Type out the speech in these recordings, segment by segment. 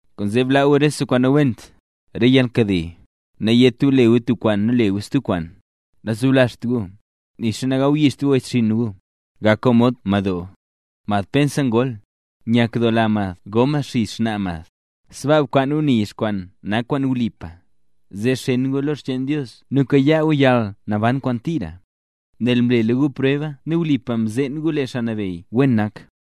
Kwaanzee blaa gu rese kwaan nawent: re yalnkade, nayét gu le gu tub kwaan nu le gu stub kwaan, nazoblazht gu, nixa nagawyixt gu wechxinn gu. Gak gu mod madoo, mad pensa ngol, nyakdoola mad go mad xizh xnaa mad, sbaaka bkwaan gu nizh kwaan nak kwaan wlipa, zee xeen gu lo re xcheen Dios nu kayaa gu yalnaban kwaan tira, nel mlela gu preba nu wlipa mzeen gu lee Xaa Nabeyy wen nak.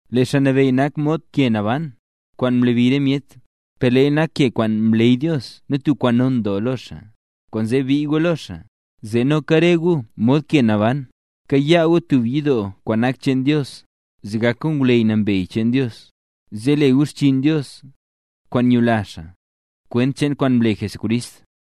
Lee Xaa Nabeyy nak mod tub ke naban, kwaan mlabi re myet, per leeya nak ke kwaan mleey Dios nu tub kwaan non doo lo xaa. Kwaanzee bii gu lo xaa, zee noka re gu mod ke naban, kaya gu tub yidoo kwaan nak cheen Dios, zee gak gu ngwleyy nambey cheen Dios, zee le gu xchiin Dios, kwaan nyula xaa, kwent cheen kwaan mle Jesucrist.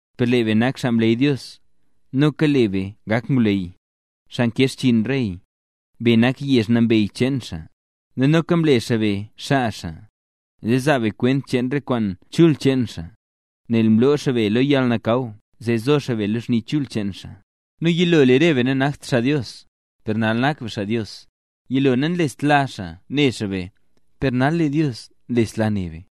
Per lee be nak xaa mleey Dios, noka lee be nak ngwleyy, xaa nkee xchiin rey, be nak yezh nambey cheen xaa. Nu noka mle xaa be xaa xaa, zee zaa be kwent cheen re kwaan chul cheen xaa, nel mloo xaa be lo yalnakaw zee zo be lo xni chul cheen xaa. Nu lee yilo, lee re be nanakt xaa Dios, per nal nak be xaa Dios; yilo nanlestla xaa ne xaa be, per nal lee Dios nlesla ne be.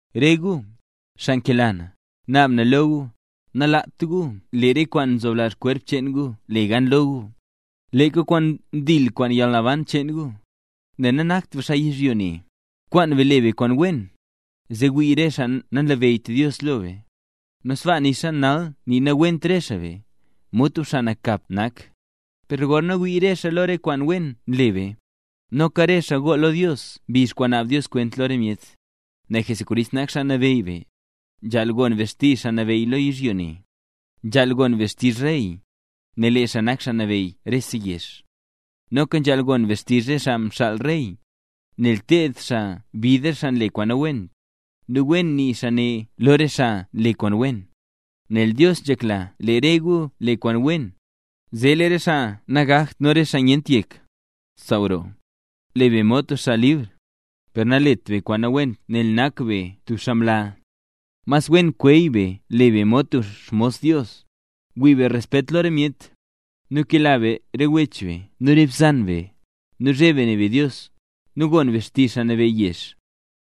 Re gu, xaa nkela na, naab na lo gu, nalaat gu lee re kwaan nzoblazh kwerp cheen gu le gan lo gu, leeka kwaan ndil kwaan yalnaban cheen gu, nel nanakt be xaa yizhyo ne. Kwaan be le be kwaan wen, zee wii re xaa nanlabeyyt Dios lo be. Nu sbaa, nixa nal nii nawent re xaa be, mod tub xaa nakap nak, per gorna wii re xaa lo re kwaan wen nle be, noka re xaa gool lo Dios mbizh kwaan naab Dios kwent lo re myet. Nel Jesucrist nak Xaa Nabeyy be, nzhaal gon be xtizh xaa nabeyy lo yizhyo ne. Nzhaal gon be xtizh rey, nel lee xaa nak xaa nabeyy rese yezh. Noka nzhaal gon be xtizh re xaa nxaal rey, nel ted xaa bid re xaa nle kwaan nawent, nu wen nii xaa ne lo re xaa nle kwaan wen. Nel Dios nzhekla lee re gu le kwaan wen, zee lee re xaa nagakt nu re xaa nyent yek, saaw roo. Le be mod tub xaa libr, per nalet be kwaan nawent nel nak be tub xaa mla. Mas wen kweey be le be mod tub xmos Dios. Wii be respet lo re myet, nu kela be re wech be nu re bzan be, nu zheb be ne be Dios, nu gon be xtizh xaa nabeyy yezh.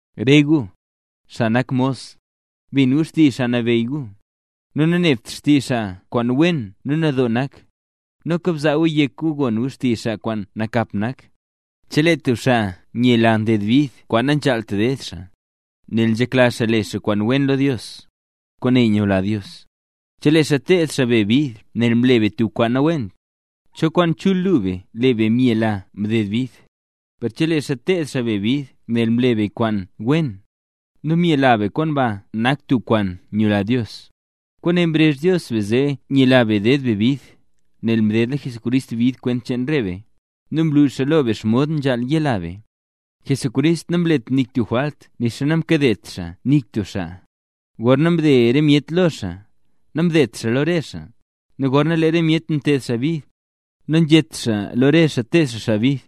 Re gu, xaa nak mos, bin gu xtizh xaa kwaan nabeyy gu, nu nanebt xtizh xaa kwaan wen nu nadoo nak, noka bzaa gu yek gu gon xtizh xaa kwaan nakap nak. Chelee tub xaa nyela nded bid kwaan nanzhaalt ded xaa, nel nzhekla xaa le xaa kwaan wen lo Dios, kwaane nyula Dios. Chelee xaa ted xaa be bid nel mle be tub kwaan nawent, ¿cho kwaan chul lu be lee be myela mded bid? Per chelee xaa ted xaa be bid nel mle be kwaan wen, nu myela be kwaan ba nak tub kwaan nyula Dios. Kwaane mrezh Dios be zee nyela be ded be bid, nel mdedla Jesucrist bid kwent cheen re be, nu mlu xaa lo be xomod nzhaal yela be. Jesucrist namlet nik tub jwalt nixa namkadet xaa nik tub xaa. Gorna mde re myet lo xaa, namdedt xaa lo re xaa; nu gorna lee re myet mted xaa bid, nanzhét xaa lo re xaa ted xaa xaa bid;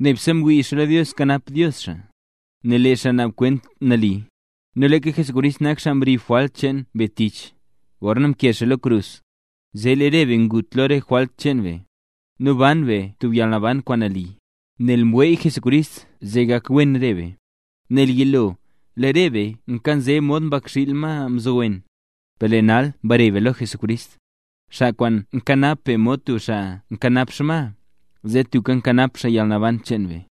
nebse mwii xaa lo Dios kanap Dios xaa, nel lee xaa naab kwent nali. Nu leeka Jesucrist nak xaa mrib jwalt cheen be tich, gorna mkee xaa lo krus, zee lee re be ngut lo re jwalt cheen be, nu ban be tub yalnaban kwaan nali. Nel mweey Jesucrist zee gakwen re be. Nel yilo, lee re be nkanze mod mbakxiil ma mzowen, per lee nal mbare be lo Jesucrist, xaa kwaan nkanap be mod tub xaa nkanap xma, zee tubka nkanap xaa yalnaban cheen be.